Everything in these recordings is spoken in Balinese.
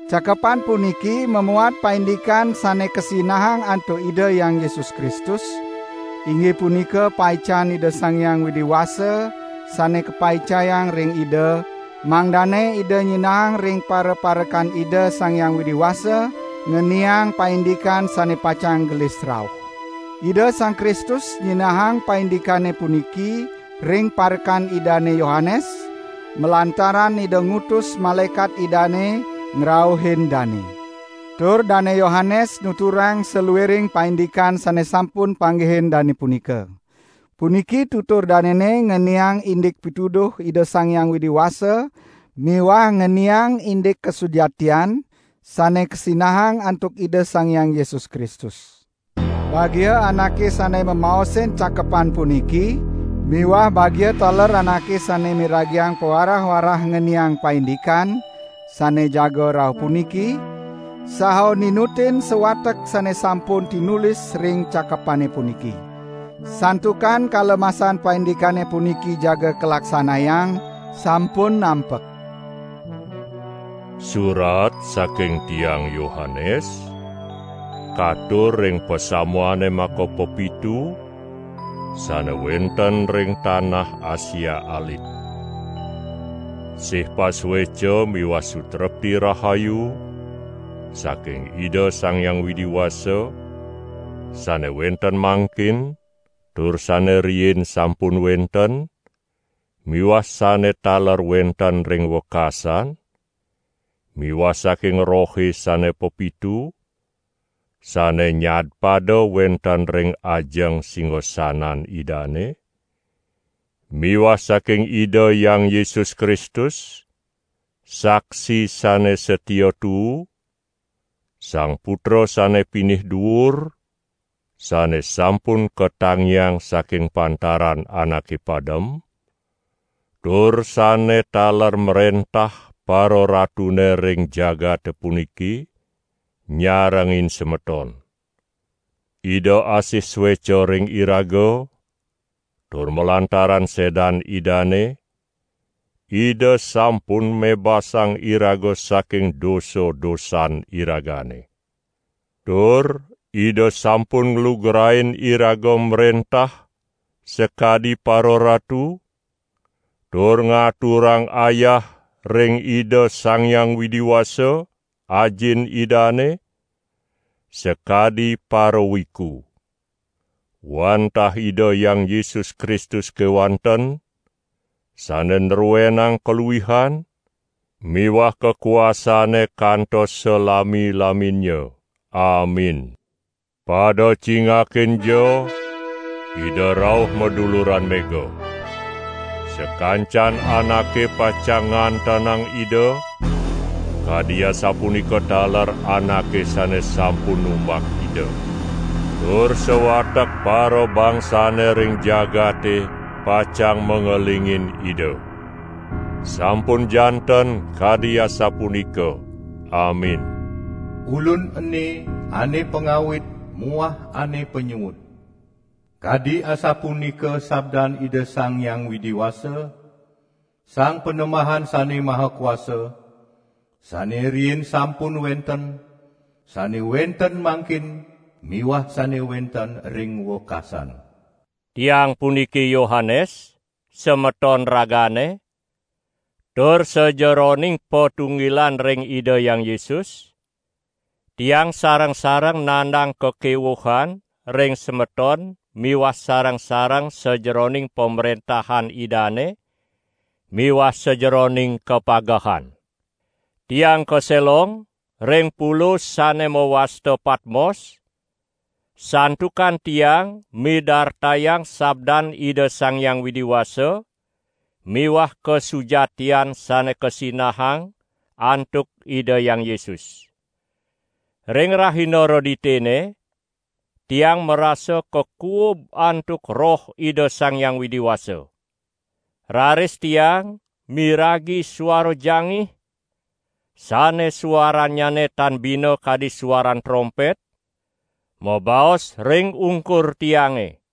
Cakepan puniki mamuat paindikan sane kasinahang antuk Ida Hyang Yesus Kristus, inggih punika paican Ida Sang Hyang Widi Wasa sane kapaicayang ring Ida, mangdane Ida nyinahang ring paraparekan Ida Sang Hyang Widi Wasa, ngeniang paindikan sane pacang gelis rauh. Ida Sang Kristus nyinahang paindikane puniki ring parekan Idane Yohanes, malantaran Ida ngutus malaekat Idane, ngrauhin dane. Tur Dane Yohanes nuturang saluiring paindikan sane sampun panggihin dane punika. Puniki tutur danene ngeniang indik pituduh Ida Sang Hyang Widi Wasa miwah ngeniang indik kasujatian sane kasinahang antuk Ida Sang Hyang Yesus Kristus. Bagia anake sane mamaosin cakepan puniki miwah bagia taler anake sane miragiang pawarah-warah ngeniang paindikan sane jaga rauh puniki, saha ninutin sawatek sane sampun tinulis ring cakepane puniki. Santukan kala masan paindikane puniki jaga kalaksanayang sampun nampek. Surat saking tiang Yohanes katur ring pasamuane makapepitu sane wenten ring tanah Asia Alit. Sih pasueca miwah sutrepti rahayu saking Ida Sang Hyang Widi Wasa sane wenten mangkin, tur sane riin sampun wenten miwah sane taler wenten ring wekasan miwah saking rohe sane pepitu, sane nyadpada wenten ring ajeng singasanan Idane, miwah saking Ida Hyang Yesus Kristus, saksi sane satia tuu, Sang Putra sane pinih duur, sane sampun katangiang saking pantaran anake padem, tur sane taler mrentah pararatune ring jagate puniki, nyarengin semeton. Ida asih sueca ring iraga, tur malantaran sedan Idane, Ida sampun mebasang iraga saking dosa-dosan iragane. Tur Ida sampun nglugrain iraga mrentah sakadi pararatu, tur ngaturang ayah ring Ida Sang Hyang Widi Wasa, Ajin Idane, sakadi parawiku. Wantah Ida Hyang Yesus Kristus kewanten sane nruenang kaluihan miwah kakuasane kantos salami-laminnya. Amin! Pada cingakinja, Ida rauh maduluran mega. Sakancan anake pacang ngantenang Ida, kadi asapunika taler anake sane sampun numbak Ida. Tur sawatek parabangsane ring jagate pacang mangelingin Ida. Sampun janten kadi asapunika. Amin. "Ulun ene ane pangawit muah ane panyuud," kadi asapunika sabdan Ida Sang Hyang Widi Wasa, Sang Panembahan Sane Maha Kuasa, sane riin sampun wenten, sane wenten mangkin miwah sane wenten ring wekasan. Tiang puniki Yohanes, semeton ragane, tur sajeroning patunggilan ring Ida Hyang Yesus, tiang sareng-sareng nandang kakewuhan ring semeton miwah sareng-sareng sajeroning Pamrentahan Idane miwah sajeroning kapagehan. Tiang kaselong ring pulo sane mawasta Patmos, santukan tiang midartayang sabdan Ida Sang Hyang Widi Wasa miwah kasujatian sane kasinahang antuk Ida Hyang Yesus. Ring rahina Reditene, tiang marasa kakuub antuk Roh Ida Sang Hyang Widi Wasa. Raris tiang miragi suara jangih, sane suarannyane tan bina kadi suaran trompet, mabaos ring ungkur tiange.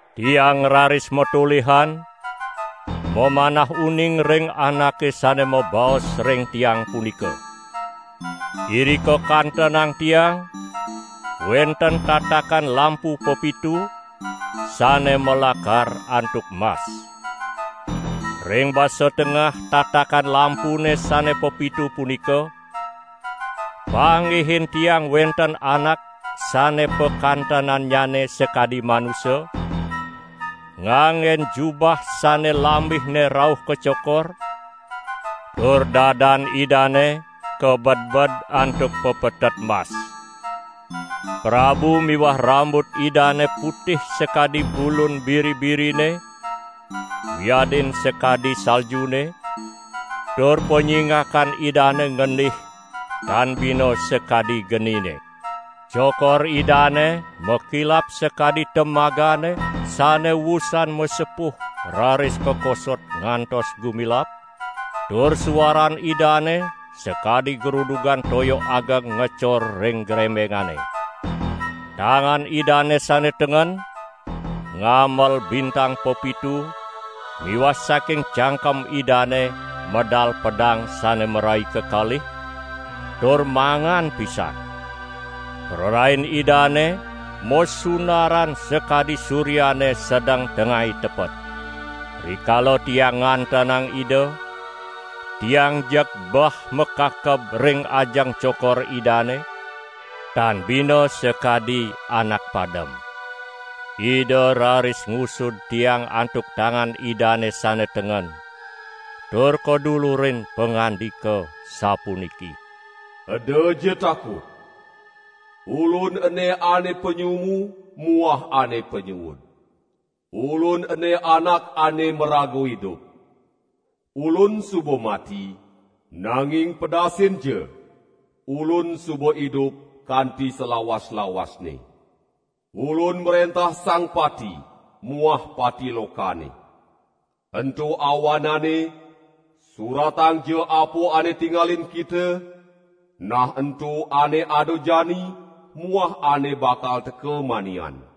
Tiang raris matolihan mamanah uning ring anake sane mabaos ring tiang punika. Irika kantenang tiang wenten tatakan lampu pepitu sane malakar antuk mas. Ring basa tengah tatakan lampune sane pepitu punika panggihin tiang wenten anak sane pakantenannyane sakadi manusa, nganggen jubah sane lambihne rauh ka cokor, tur dadan Idane kabedbed antuk pepetet mas. Prabu miwah rambut Idane putih sakadi bulun biri-birine wiadin sakadi saljune, tur panyingakan Idane ngendih tan bina sakadi genine. Cokor Idane makilap sakadi temagane sane wusan masepuh raris kakosot ngantos gumilap, tur suaran Idane sakadi grudugan toya ageng ngecor ring grembengane. Tangan Idane sane tengen ngamel bintang pepitu miwah saking cangkem Idane medal pedang sane marai kekalih tur mangan pisan. Prarain Idane masunaran sakadi suryane sedeng tengai tepet. Rikala tiang ngantenang Ida, tiang jeg bah makakeb ring ajeng cokor Idane, tan bina sakadi anak padem. Ida raris ngusud tiang antuk tangan Idane sane tengen tur kadulurin pangandika sapuniki: "Edaja takut! Ulun ene ane panyumu muah ane panyuud. Ulun ene anak ane maraga idup. Ulun suba mati, nanging pedasinja, Ulun suba idup kanti salawas-lawasne. Ulun mrentah Sang Pati muah Pati Lokane. Ento awanane, suratangja apa ane tingalin kita, nah ento ane ada jani muah ane bakal teka manian.